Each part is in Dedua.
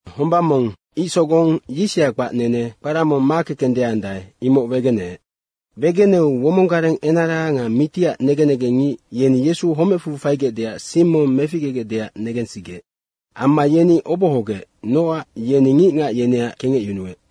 Hombang mong, ic sogong yisya kpac nene, kpara mong makekeng deandae, imoc wegeneec. Wegeneu womong gareng enara nga mitiac negen negengngic yeni Yesu homecfu faigecdeac sing mong meficgegecdeac negensigec. Amma yeni obohogec nocac yeni ngicngac yeneac kengecyunuec.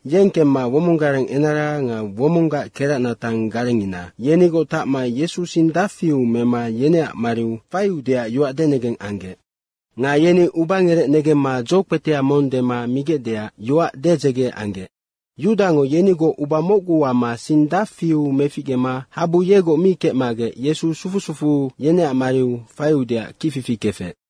yeng kemma womong gareng enara nga womonggac keracnatang garengngina, yenigoc tacma Yesu sing dafiu mema yeneac mariu faiudeac yoac denegeng anggec. Nga yeni ubangerec negemma dzo kpetea mong dema migecdeac yoac dedzege anggec. Yudango yenigoc uba mocgu amma sing dafiu meficgema habu yegoc mi kecmagec Yesu sufu sufuu yeneac mariu faiudeac kicfifi kefec.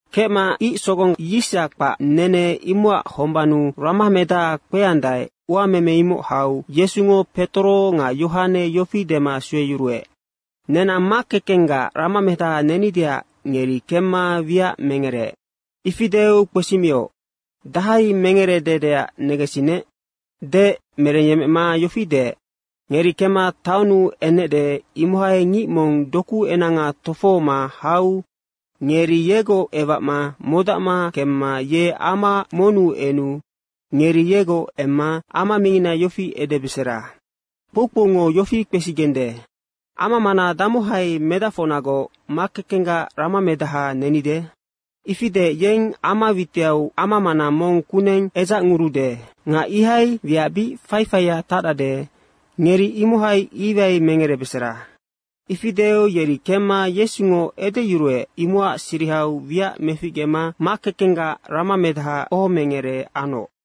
Kecma ic sogong yisya kpac nene, imocac hombannu ramamedaha kpeandae, uameme imoc hau Yesungo Petoro nga Yohane yofi dema sueyuruec, “Nenang makekenggac ramamedaha nenideac ngeri kemma wiac mengereec.” Ifi deu kpesimioc, “Dahai mengerededeac negensinec?” Deec merengyecmema yofi deec, “Ngeri kemma taonnu enecde, imohai ngic mong dokuenanga tofohoma hau ngeri yegoc ewacma modacma kemma ye ama monnu enu ngeri yegoc emma ama mingina yofi edebesera, ‘Kpoukpoungo yofi kpesigende, amamana damohai medacfocnagoc makekenggac ramamedaha nenide?’ Ifi deec yeng ama witiau amamana mong kuneng edzacnguruude. Nga ihai wiac bic faifaia tacdacde, ngeri imohai iwai mengerebesera.” Ifi deu yeri kemma Yesungo edeyuruec, imocac sirihau wiac meficgema makekenggac ramamedaha ohomengere anoc.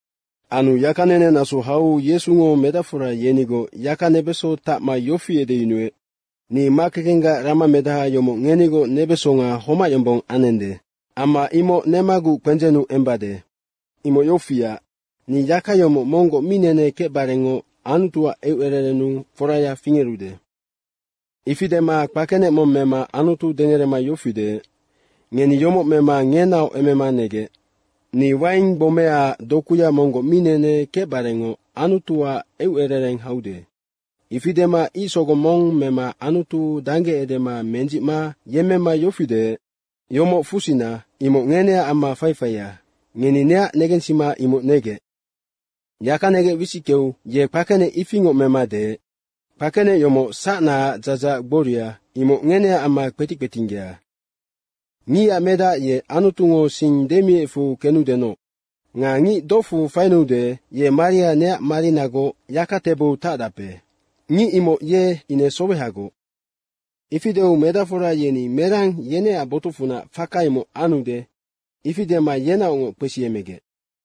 Anu yakanene naso hau Yesungo medacfora yenigoc yaka nebeso tacma yofi edeyunuec, “Ni makekenggac ramamedaha yomoc ngenigoc nebesonga homac yombong anende. Amma imoc nemaguc kpendzennu embade. Imoc yofiac, ni yaka yomoc monggoc mi nene kecbarengoc Anutuac eucererennu foraya fingerude.” Ifi dema kpakenec mong mema Anutu dengerema yofi deec, “Ngeni yomoc mema ngenaoc emema negec. Ni waing gbomeaac dokuya monggoc mi nene kecbarengoc Anutuac eucerereng haude.” Ifi dema ic sogong mong mema Anutu dangge edema mendzicma yemmema yofi deec, “Yomoc fusina, imoc ngeneac amma faifaia. Ngeni neac negensima imoc negec.” Yaka negec wisickeu ye kpakenec ifingoc mema deec, “Kpakenec yomoc sacnaac dzadzahac gboria, imoc ngeneac amma kpetic kpetinggea. Ngicac Medac ye Anutungo sing demiecfu kenudenoc nga ngic docfu fainuude, ye maria neac marinagoc yakatebou tacdape, ngic imoc ye ine sowehagoc.” Ifi deu medacfora yeni merang yeneac botucfunac faka imoc anude, ifi dema yenaocngoc kpesiemegec.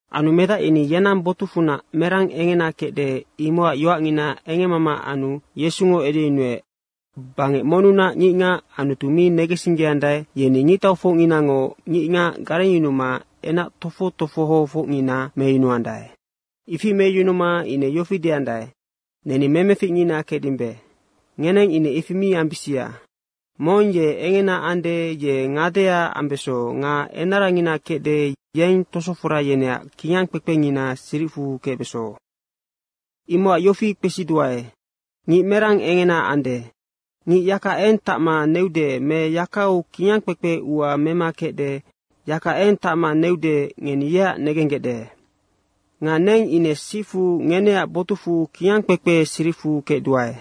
Anu medac yeni yenang botucfunac merang engena kecde, imocac yoacngina engemmama anu Yesungo edeyunuec, “Bangec monnunac ngicngac Anutu mi negensinggeandae, yeni ngictaufocnginango ngicngac garengyunuma enac tofoc tofohofocngina meyunuandae. Ifi meyunuma ine yofi deandae, ‘Neni memeficngina kecdimbe.’” Ngeneng ine ifi mi ambisia. Mong ye engena ande, ye ngadea ambeso nga enarangina kecde, yeng tosofora yeneac kingangkpekpengina siricfu kecbeso. Imocac yofi kpesiduae, ngic merang engena ande? Ngic yaka eng tacma neude me yakau kingangkpekpe ua mema kecde? Yaka eng tacma neude, ngeni yeac negenggecde. Nga neng ine sifu ngeneac botucfu kingangkpekpe siricfu kecduae.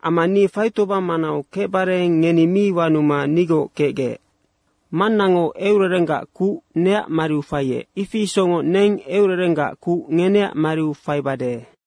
Amma ni faitobang manau kecbareng ngeni mi wanuma nigoc kecgec. Mannango eucererenggac kuc neac mariu faiec, ifi isocngoc neng eucererenggac kuc ngeneac mariu faibade.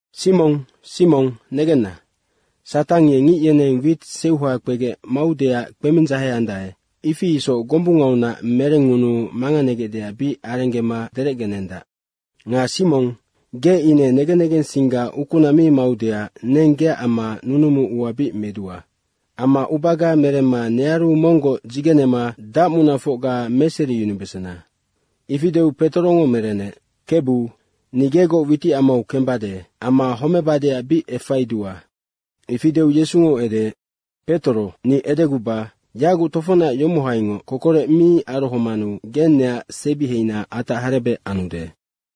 “Simong, Simong, negenna, Satang ye ngic yeneng wit seuha kpegec maudeac kpemindzaheandae, ifi isoc gombungaunac merengngunuu manganegecdeac bic arenggema derecgenendac. Nga Simong ge ine negen negensingga ukuna mi maudeac, neng geac amma nunumu ua bic medua. Amma ubaga meremma nearu monggoc dzigenema dacmunafocga meseriyunubesena.” Ifi deu Petorongo merenec, “Kebu, ni gegoc witicamau kembade amma homebadeac bic efaidua.” Ifi deu Yesungo edeec, “Petoro, ni edeguba yaguc tofocnac yomohaingoc kokorec mi arohomanu geng neac sebiheina atac harebec anude.”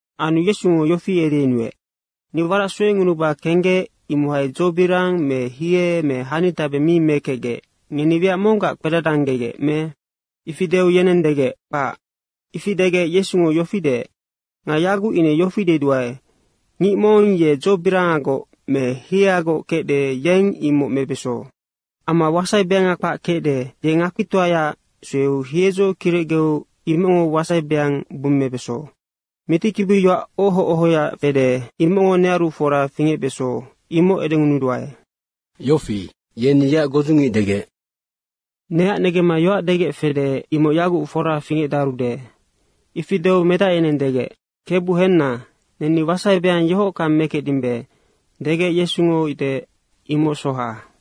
Anu Yesungo yofi edeyunuec, “Ni warac suengunuba kenggec, imohai dzobirang me hie me hanitabe mi mekecgec ngeni wiac monggac kpedadanggegec me?” Ifi deu yeneng degec, “Kpac.” Ifi degec Yesungo yofi deec, “Nga yaguc ine yofi deduae, Ngic mong ye dzobirangagoc me hieagoc kecde, yeng imoc mebeso. Amma wasaibeanga kpac kecde, ye ngakpitoaya sueu hiedzo kirecgeu imocngo wasaibeang bummebeso. Mitikibiu yoac oho ohoya fede, imocngo nearu fora fingecbeso, imoc edengunuduae. Yofi, ‘Yeni yeac godzungic degec.’ Neac negemma yoac degec fede, imoc yaguc fora fingecdarude.” Ifi deu medac yeneng degec, “Kebu henna, neni wasaibeang yohockang mekecdimbe.” degec Yesungo deec, “Imoc soha.”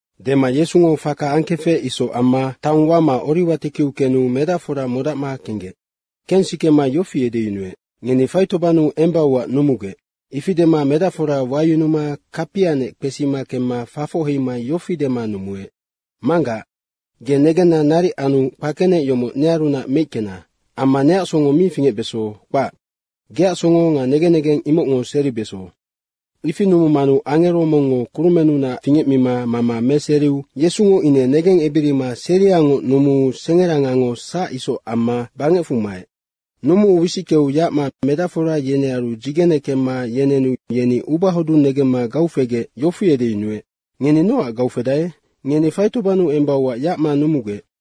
Dema Yesungo faka angkefec isoc amma taong wama Oriwa tikiu kenu medacfora modacma kenggec. Kensikema yofi edeyunuec, “Ngeni faitobannu embauac numugec.” Ifi dema medacfora wayunuma kapianec kpesima kemma fafoc heima yofi dema numuec, “Manggac, ge negenna naric anu kpakenec yomoc nearunac meickena. Amma neac songo mi fingecbeso, kpac. Geac songo nga negen negeng imocngo seribeso.” Ifi numumanu angero mongngo kurumennunac fingecmima mama meseriu Yesungo ine negengebirima seriangoc numuu sengerangango sac isoc amma bangecfu maec. Numuu wisickeu yacma medacfora yenearu dzigene kemma yenenu yeni ubahodung negemma gau fegec yofi edeyunuec, “Ngeni nocac gau fedae? Ngeni faitobannu embauac yacma numugec.”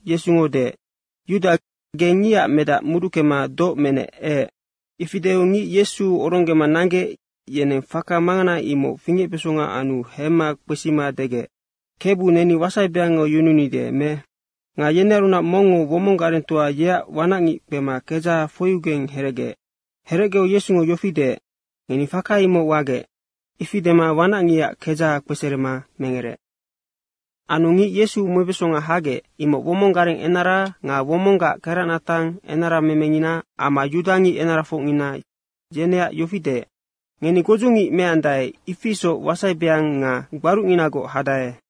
Yesungo deec, “Yuda, ge Ngicac Medac muduckema doc menec, ec.” Ifi deu ngic Yesu oronggema nanggec, yeneng faka mangana imoc fingecbesonga anu hemma kpesima degec, “Kebu, neni wasaibeango yununide me?” Nga yenearunac mongngo womong garengtoa yeac wanacngic kpema kedzaha foiugeng herecgeec. Herecgeu Yesungo yofi deec, “Ngeni faka imoc wagec.” Ifi dema wanacngicac kedzaha kpeserema mengereec. Anu ngic Yesu mebesonga hagec, imoc womong gareng enara nga womonggac keracnatang enaramemengina amma yudangic enarafocngina yeneac yofi deec, “Ngeni godzungic meandae, ifi isoc wasaibeang nga gbarucnginagoc hadae.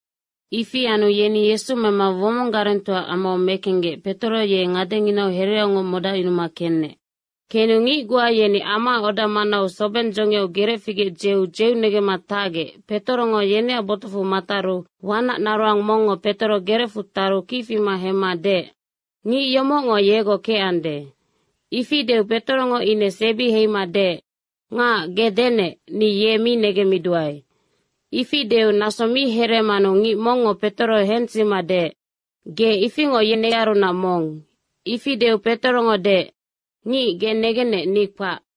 Ifi anu yeni Yesu mema womong garengtoaac amau mekenggec Petoro ye ngadenginau hereaungoc modacyunuma kenec. Kenu ngic goa yeni amaac oda manau sobeng dzongiau gerec figec dzeu dzeunegemma tacgec Petorongo yeneac botucfu mataru wanac naroang mongngo Petoro gerecfu taru kic fima hemma deec, “Ngic yomocngo yegoc kecande.” Ifi deu Petorongo ine sebi heima deec, “Ngac, ge denec, ni ye mi negemmiduae.” Ifi deu naso mi hereemanu ngic mongngo Petoro hensima deec, “Ge ifingoc yenearunac mong.” Ifi deu Petorongo deec, “Ngic, ge negennec ni kpac.”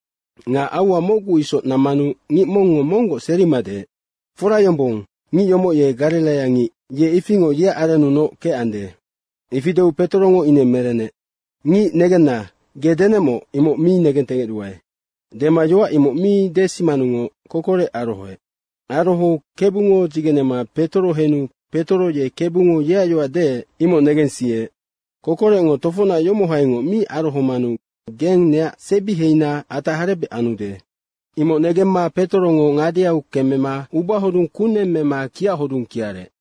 Nga aua mocgu isoc nammanu ngic mongngo monggoc serima deec, “Fora yombong, ngic yomoc ye gariraiangic, ye ifingoc yeac arennunoc kecande.” Ifi deu Petorongo ine merenec, “Ngic negenna, ge denecmoc, imoc mi negentegecduae.” Dema yoac imoc mi desimanungoc kokorecngo arohoec. Arohou Kebungo dzigenema Petoro henu Petoro ye Kebungo yeac yoac deec, imoc negensiec, “Kokorecngo tofocnac yomohaingoc mi arohomanu geng neac sebiheina atac harebec anude.” Imoc negemma Petorongo ngadeau kemema ubahodung kuneng mema kiac hodung kiarec.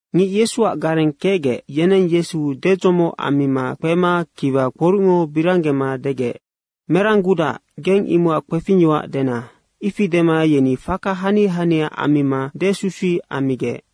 Ngic Yesuac gareng kecgec, yeneng Yesu dedzomoc ammima kpema kiwa kporucngo biranggema degec, “Merang gudac, geng imocac kpefingyoac dena.” Ifi dema yeni faka hania hania ammima desusuic ammigec.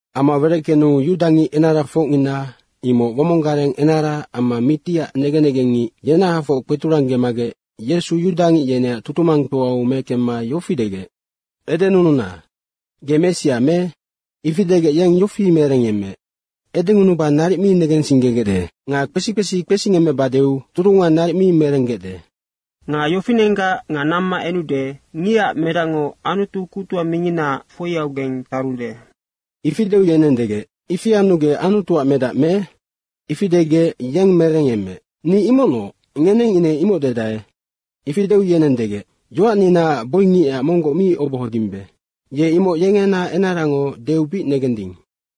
Ama wereckenu yudangic enarafocngina, imoc womong gareng enara amma mitiac negen negengngic yenahafoc kpeturanggemagec Yesu yudangic yeneac tutumangtoau mekemma yofi degec, “Edenununa, ge Messia me?” Ifi degec yeng yofi merengyemmeec, “Edengunuba naric mi negensinggegecde. Nga kpesi kpesi kpesingemmebadeu turunga naric mi merenggecde. Nga yofinenggac nga namma enude Ngicac Medacngo Anutu Kuctoa minginaac foiaugeng tarude.” Ifi deu yeneng degec, “Ifi anu ge Anutuac Medac me?” Ifi degec, yeng merengyemmeec, “Ni imocnoc, ngeneng ine imoc dedae.” Ifi deu yeneng degec, “Yoacninaac boingicac monggoc mi obohodimbe. Ye imoc yengena enarango deu bic negending.”